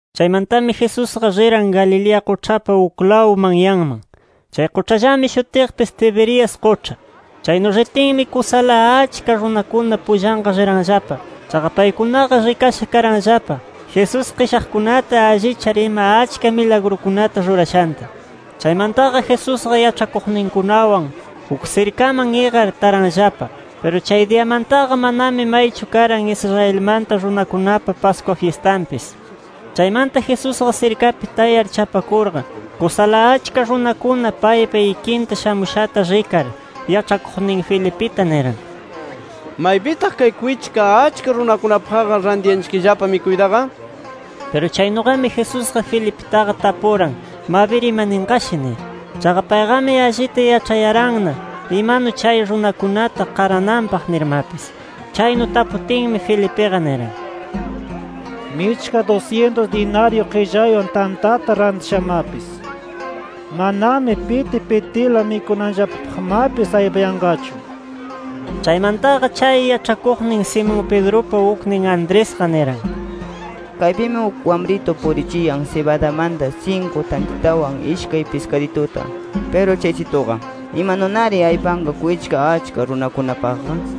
Chaymantami Jesusqa riran Galilea quĉhapa uklawn manyanman. Chay quĉhallami shutiqpis, Tiberias quĉha. Chaynu ritinmi, kusala achka runakuna pullanqa riranllapa. Chaqa paykunaqa rikasha karanllapa, Jesús qishaqkunata allichar ima achka milagrukunata rurashanta. Chaymantaqa Jesusqa yaĉhakuqninkunawan uk sirkaman iqar taranllapa. Piru chay diyamantaqa manami maychu karan Israelmanta runakunapa Pascua fyistanpis. Chaymanta Jesusqa sirkapi tayar chapakurqa, kusala achka runakuna paypa ikinta shamushata rikar, yaĉhakuqnin Felipita niran: —¿Maypitaq kay kwichka achka runakunapaqqa, rantiyanchikllapa mikuytaqa? Piru chaynuqami Jesusqa Felipitaqa tapuran, mabir imaninqashi nir. Chaqa payqami allita yaĉhayaranna imanu chay runakunata qarananpaq nirmapis. Chaynu taputinmi, Felipiqa niran: —Michka dusyintus dinaryu qillaywan tantata rantishamapis, manami piti pitila mikunanllapapaqmapis aypayanqachu nir. Chaymantaqa, chay yaĉhakuqnin Simón Pedrupa uknin Andresqa, niran: —Kaypimi uk wamritu purichiyan sibadamanta sinku tantitawan ishkay piskadituta. Piru chaysituqa, ¿imanunari aypanqa kwichka achka runakunapaqqa? nir.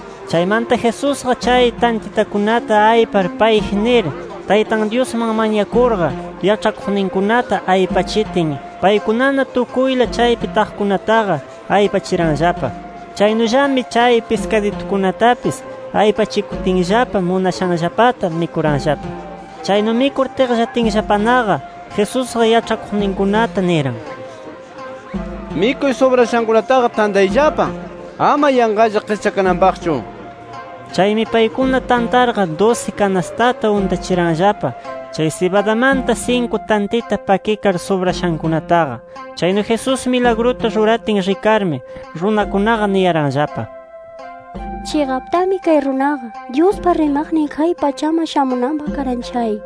Chaymanta Jesusqa, chay tantitakunata aypar payji nir, Taytan Dyusman mañakurqa, yaĉhakuqninkunata aypachitin, paykunana tukuyla chaypi taqkunataqa aypachiranllapa. Chaynullami chay piskaditukunatapis aypachikutinllapa munashanllapata mikuranllapa. Chaynu mikur tiqllatinllapanaqa, Jesusqa yaĉhakuqninkunata niran: —Mikuy subrashankunataqa tantayllapa ama yanqalla qischakananpaqchu nir. Chaymi paykuna tantarqa dusi kanastata untachiranllapa, chay sibadamanta sinku tantita pakikar subrashankunataqa. Chaynu Jesús milagruta ruratin rikarmi, runakunaqa niyaranllapa: —Chiqaptami kay runaqa, Dyuspa rimaqnin kay pachaman shamunanpaq karan chay nir.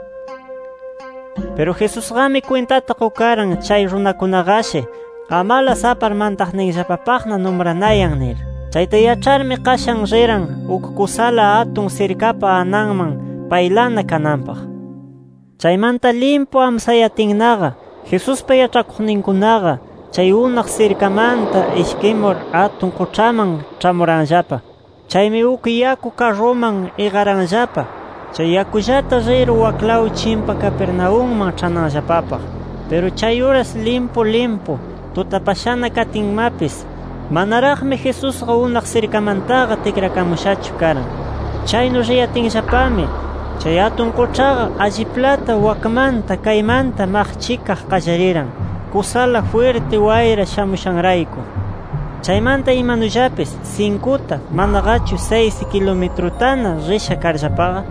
Piru Jesusqami kwintata qukaran, chay runakunaqashi amalas apar mantaqninllapapaqna numranayan nir. Chayta yaĉharmi, qashan riran uk kusala atun sirkapa ananman, paylana kananpaq. Chaymanta limpu amsayatinnaqa, Jesuspa yaĉhakuqninkunaqa chay unaq sirkamanta ishkimur atun quĉhaman ĉhamuranllapa. Chaymi uk yaku karruman iqaranllapa, chay yakullata rir waklaw chimpa Capernaumman ĉhananllapapaq. Piru chay uras limpu limpu tutapashana katinmapis, manaraqmi Jesusqa unaq sirkamantaqa tikrakamushachu karan. Chaynu riyatinllapami, chay atun quĉhaqa alliplata wakmanta kaymanta maqchikaq qallariran, kusala jwirti wayra shamushanrayku. Chaymanta imanullapis sinkuta, manaqachu saysi kilumitrutana risha karllapaqa,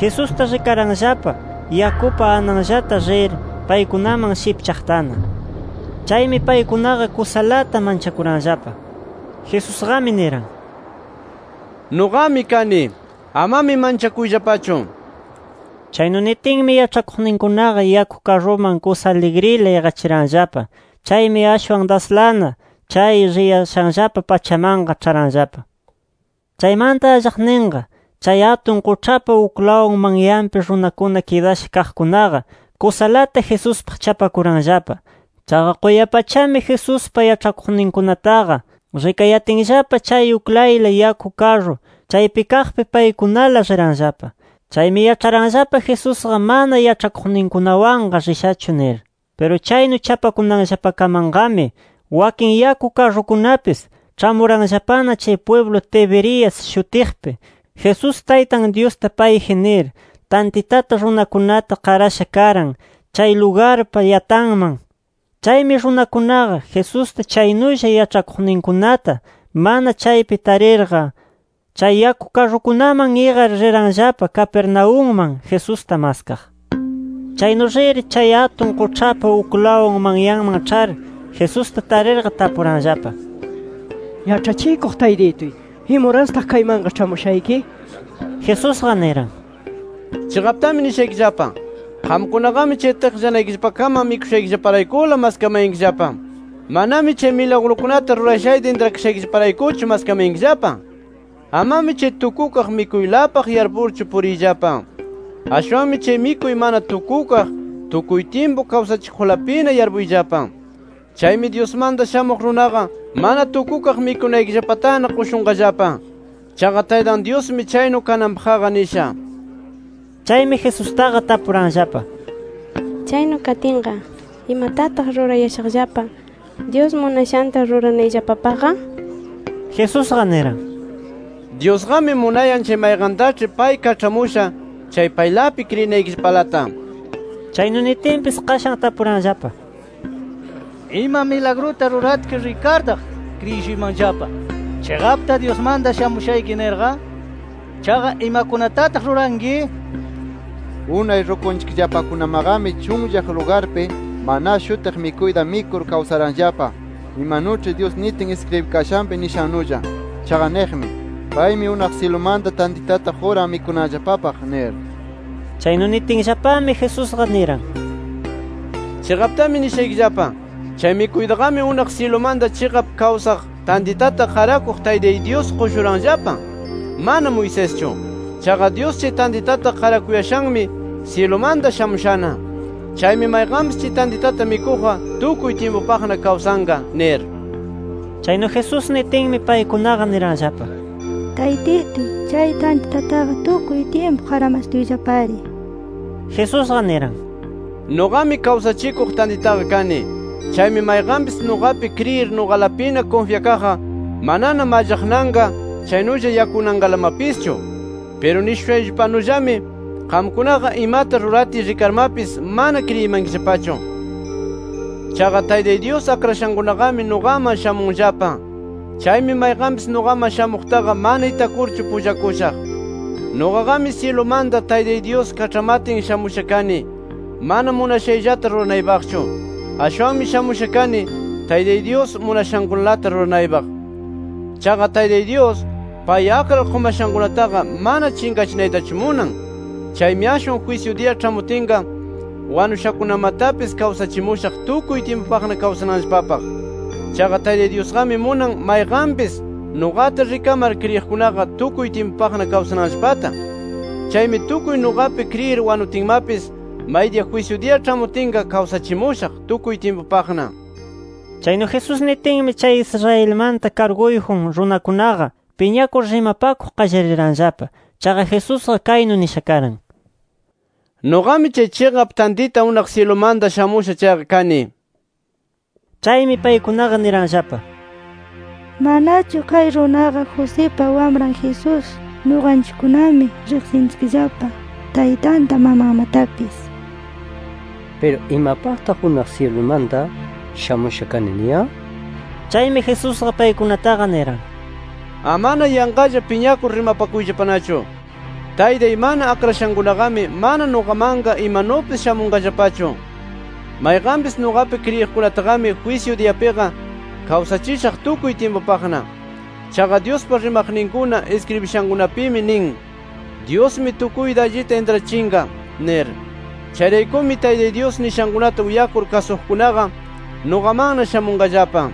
Jesusta rikaranllapa yakupa ananllata rir paykunaman shipchaqtana. Chaymi paykunaqa kusalata manchakuranllapa. Jesusqami niran: —¡Nuqami kani! ¡Amami manchakuyllapachu! nir. Chaynu nitinmi, yaĉhakuqninkunaqa yaku karruman kusa aligrila iqachiranllapa. Chaymi ashwan daslana chay riyashanllapa pachamanqa ĉharanllapa. Chaymanta allaqninqa, chay atun quĉhapa uklaw manyanpi runakuna kidasha kaqkunaqa kusalata Jesuspaq chapakuranllapa. Chaqa quya-pachami Jesuspa yaĉhakuqninkunataqa rikayatinllapa chay uklayla yaku karru chaypi kaqpi paykunala riranllapa. Chaymi yaĉharanllapa Jesusqa mana yaĉhakuqninkunawanqa rishachu nir. Piru chaynu chapakunanllapakamanqami, wakin yaku karrukunapis ĉhamuranllapana chay pwiblu Tiberias shutiqpi, Jesús Taytan Dyusta payji nir, tantitata runakunata qarasha karan, chay lugarpa yatanman. Chaymi runakunaqa, Jesusta chaynulla yaĉhakuqninkunata mana chaypi tarirqa, chay yaku karrukunaman iqar riranllapa Capernaumman, Jesusta maskaq. Chaynu rir, chay atun quĉhapa uklaw manyanman ĉhar, Jesusta tarirqa tapuranllapa: —Yaĉhachikuq Taytituy, ¿imurastaq kaymanqa ĉhamushayki? nir. Jesusqa niran: —Chiqaptami nishaykillapa: Qamkunaqami chay tiqllanaykillapakaman mikushaykillaparaykula maskamayankillapa. Manami chay milagrukunata rurashayta intrakashaykillaparaykuchu maskamayankillapa. Amami chay tukukaq mikuylapaq yarpurchu puriyllapa. Ashwanmi chay mikuy mana tukukaq, tukuy tyimpu kawsachikuqlapina yarpuyllapa. Chaymi Dyusmanta Shamuq Runaqa, mana tukukaq mikunaykillapatana qushunqallapa. Chaqa Taytan Dyusmi chaynu kananpaqqa nisha. Chaymi, Jesustaqa tapuranllapa: —Chaynu katinqa, ¿imatataq rurayashaqllapa, Dyus munashanta ruranayllapapaqqa? nir. Jesusqa, niran: —Dyusqami munayan chay mayqantaĉhi pay kaĉhamusha chay paylapi kriyinaykillapalata nir. Chaynu nitinpis, qashan tapuranllapa: —¿Ima milagruta ruratki rikartaq, kriyishuymanllapa, chiqapta Dyusmanta shamushayki nirqa? ¿Chaqa imakunatataq ruranki? Unay rukunchikllapakunamaqami chunllaq lugarpi ‘maná’ shutiq mikuyta mikur kawsaranllapa, imanuĉhi Dyus nitin iskribikashanpi nishannulla. Chaqa niqmi: ‘Paymi unaq syilumanta tantitata quran mikunanllapapaq’ nir. Chaynu nitinllapami, Jesusqa niran: —Chiqaptami nishaykillapa: Chay mikuytaqami unaq syilumanta chiqap kawsaq tantitata qarakuq Taytay Dyus qushuranllapa, mana Moiseschu. Chaqa Dyus chay tantitata qarakuyashanmi, syilumanta shamushana. Chaymi mayqanpis chay tantitata mikuqqa tukuy tyimpupaqna kawsanqa nir. Chaynu Jesús nitinmi, paykunaqa niranllapa: —Taytituy, chay tantitataqa tukuy tyimpu qaramastuyllapari, nir. Jesusqa niran: —Nuqami, kawsachikuq tantitaqa kani. Chaymi mayqanpis nuqapi kriyir nuqalapina kunfyakaqqa, manana mallaqnanqa chaynulla yakunanqalamapischu. Piru nishushayllapanullami, qamkunaqa imata ruratiy rikarmapis mana kriyimankillapachu. Chaqa Taytay Dyus akrashankunaqami nuqaman shamunllapa. Chaymi mayqanpis nuqaman shamuqtaqa mana itakurchu pullakushaq. “Nuqaqami syilumanta, Taytay Dyus kaĉhamatin shamusha kani, mana munashayllata ruranaypaqchu. Ashwan shamusha kani, Taytay Dyus munashankunalata ruranaypaq. Chaqa Taytay Dyus, pay akrar qumashankunataqa mana chinqachinaytachu munan. Chaymi ashwan jwisyu diya ĉhamutinqa, wanushakunamatapis kawsachimushaq tukuy tyimpupaqna kawsananllapapaq. Chaqa Taytay Dyusqami munan, mayqanpis nuqata rikamar kriyiqkunaqa tukuy tyimpupaqna kawsananllapata. Chaymi tukuy nuqapi kriyir wanutinmapis, maydiya jwisyu diya ĉhamutinqa kawsachimushaq tukuy tyimpupaqna” nir. Chaynu Jesús nitinmi, chay Israelmanta karguyjun runakunaqa piñakur rimapakuq qallariranllapa. Chaqa Jesusqa kaynu nisha karan: “Nuqami chay chiqap tantita unaq syilumanta shamusha chayqa” kani nir. Chaymi paykunaqa niranllapa: —¿Manachu kay runaqa, Josipa Wamran Jesús? Nuqanchikkunami riqsinchikllapa taytanta mamanmatapis. Piru ¿imapaqtaq, unaq syilumanta shamusha kani, niyan? Chaymi Jesusqa paykunataqa, niran: —Amana yanqalla piñakur rimapakuyllapanachu. Taytay mana akrashankunaqami, mana nuqamanqa imanupis shamunqallapachu. Mayqanpis nuqapi kriyiqkunataqami jwisyu diyapiqa kawsachishaq tukuy tyimpupaqna. Chaqa Dyuspa rimaqninkuna iskribishankunapimi nin: ‘Dyusmi tukuyta allita intrachinqa’ nir. Chayraykumi, Taytay Dyus nishankunata uyakur kasuqkunaqa, nuqamanna shamunqallapa.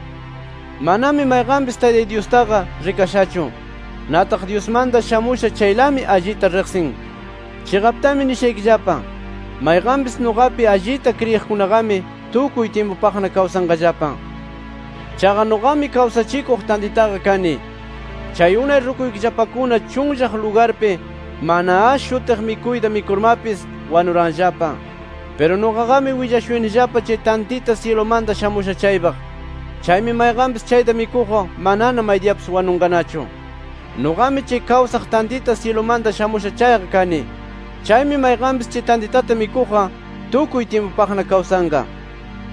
“Manami mayqanpis Taytay Dyustaqa rikashachu. Nataq Dyusmanta shamusha chaylami allita riqsin. Chiqaptami nishaykillapa: Mayqanpis nuqapi allita kriyiqkunaqami tukuy tyimpupaqna kawsanqallapa. Chaqa nuqami kawsachikuq tantitaqa kani. Chay unay rukuykillapakuna chunllaq lugarpi ‘maná’ shutiq mikuyta mikurmapis, wanuranllapa. Piru nuqaqami willashuyanillapa chay tantita syilumanta shamusha chaypaq. Chaymi mayqanpis chayta mikuqqa manana maydiyapis wanunqanachu. Nuqami chay kawsaq tantita syilumanta shamusha chayqa kani. Chaymi mayqanpis chay tantitata mikuqqa tukuy tyimpupaqna kawsanqa.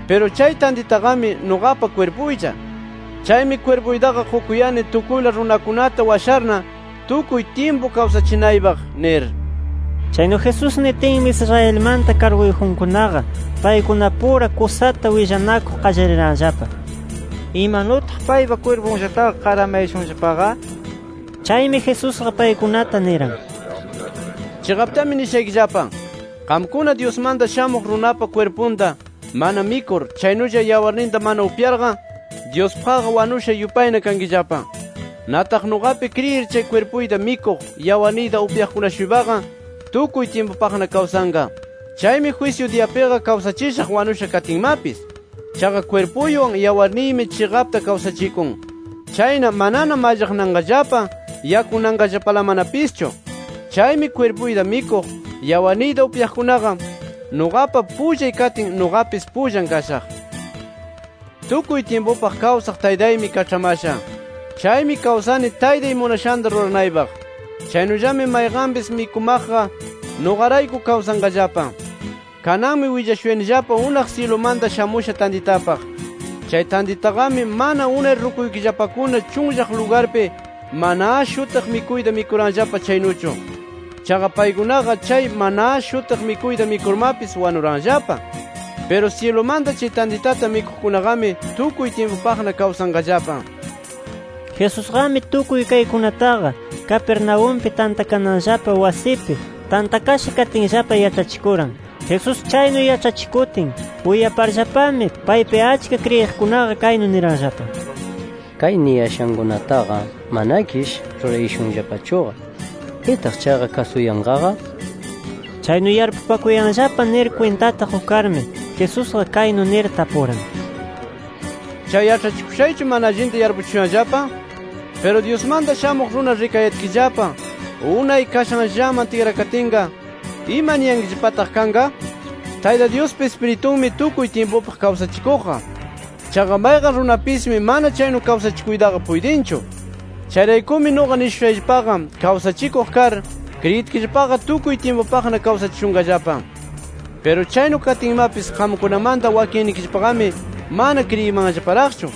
Piru chay tantitaqami nuqapa kwirpuylla. Chaymi kwirpuytaqa qukuyani tukuyla runakunata washarna, tukuy tyimpu kawsachinaypaq” nir. Chaynu Jesús nitinmi Israelmanta karguyjunkunaqa paykunapura kusata willanakuq qallariranllapa: “¿Imanutaq paypa kwirpunllataqa qaramayashunllapaqa?” nir. Chaymi Jesusqa paykunata niran: —Chiqaptami nishaykillapa: Qamkuna, Dyusmanta Shamuq Runapa kwirpunta mana mikur chaynulla yawarninta mana upyarqa, Dyuspaqqa wanusha yupayna kankillapa. Nataq nuqapi kriyir chay kwirpuyta mikuq, yawarniyta upyaqkuna-shuypaqa tukuy tyimpupaqna kawsanqa. Chaymi jwisyu diyapiqa, kawsachishaq wanusha katinmapis. Chaqa kwirpuywan yawarniymi chiqapta kawsachikun. Chayna, manana mallaqnanqallapa, yakunanqallapalamanapischu. Chaymi kwirpuyta mikuq, yawarniyta upyaqkunaqa, nuqapa pullay katin, nuqapis pullan kashaq. “Tukuy tyimpupaq kawsaq Taytaymi kaĉhamasha. Chaymi kawsani Taytay munashanta ruranaypaq. Chaynullami mayqanpis mikumaqqa, nuqarayku kawsanqallapa. Kananmi willashuyanillapa unaq syilumanta shamusha tantitapaq. Chay tantitaqami, mana unay rukuykillapakuna chunllaq lugarpi ‘maná’ shutiq mikuyta mikuranllapa chaynuchu. Chaqa paykunaqa chay ‘maná’ shutiq mikuyta mikurmapis, wanuranllapa. Piru syilumanta chay tantitata mikuqkunaqami tukuy tyimpupaqna kawsanqallapa” nir. Jesusqami tukuy kaykunataqa Capernaumpi tantakananllapa wasipi tantakasha katinllapa yaĉhachikuran. Jesús chaynu yaĉhachikutin uyaparllapami paypi achka kriyiqkunaqa, kaynu niranllapa: —Kay niyashankunataqa manakish rurayashunllapachuqa. ¿Pitaq chaqa kasuyanqaqa? nir. Chaynu yarpupakuyanllapa nir kwintata qukarmi, Jesusqa kaynu nir tapuran: —¿Chay yaĉhachikushaychu, mana allinta yarpuchishuyanllapa? Piru Dyusmanta Shamuq Runa rikayatkillapa, unay kashanllaman tikrakatinqa, ¿imaniyankillapataq kanqa? Tayta Dyuspa Ispiritunmi tukuy tyimpupaq kawsachikuqqa. Chaqa mayqan runapismi mana chaynu kawsachikuytaqa puytinchu. Chayraykumi nuqa nishushayllapaqa kawsachikuq kar, kriyitkillapaqa tukuy tyimpupaqna kawsachishunqallapa. Piru chaynu katinmapis qamkunamanta wakinnikillapaqami mana kriyimanllaparaqchu.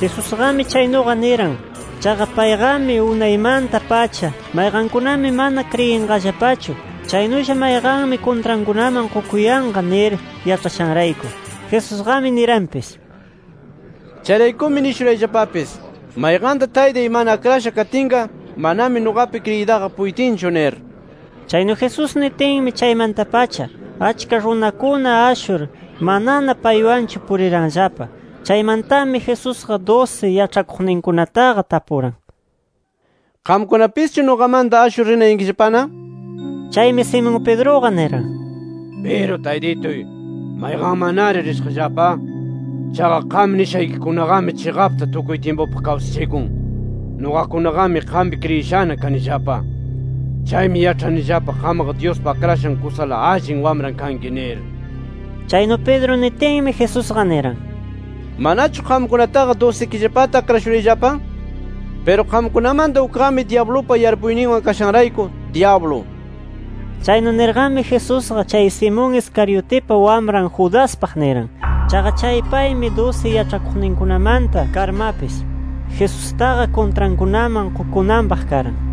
Jesusqami chaynuqa niran, chaqa payqami unaymanta-pacha, mayqankunami mana kriyinqallapachu, chaynulla mayqanmi kuntrankunaman qukuyanqa nir yaĉhashanrayku. Jesusqami niranpis: —Chayraykumi nishurayllapapis: Mayqanta Taytay mana akrasha katinqa, manami nuqapi kriyiytaqa puytinchu nir. Chaynu Jesús nitinmi, chaymanta-pacha achka runakuna ashur, manana paywanchu puriranllapa. Chaymantami, Jesusqa dusi yaĉhakuqninkunataqa tapuran: —¿Qamkunapischu nuqamanta ashur rinayankillapana? nir. Chaymi Simón Pedruqa niran: —Piru Taytituy, ¿mayqanmannari rishaqllapa? Chaqa qam nishaykikunaqami chiqapta tukuy tyimpupaq kawsachikun. Nuqakunaqami qampi kriyishana kanillapa. Chaymi yaĉhanillapa, qamqa Dyuspa Akrashan kusala Allin Wamran kanki, nir. Chaynu Pedro nitinmi, Jesusqa niran: —¿Manachu qamkunataqa dusikillapata akrashurayllapa? Piru qamkunamanta ukqami, dyablupa yarpuyninwan kashanrayku, dyablu. Chaynu nirqami, Jesusqa chay Simón Iscariotipa wamran Judaspaq, niran. Chaqa chay paymi dusi yaĉhakuqninkunamanta karmapis, Jesustaqa kuntrankunaman qukunanpaq karan.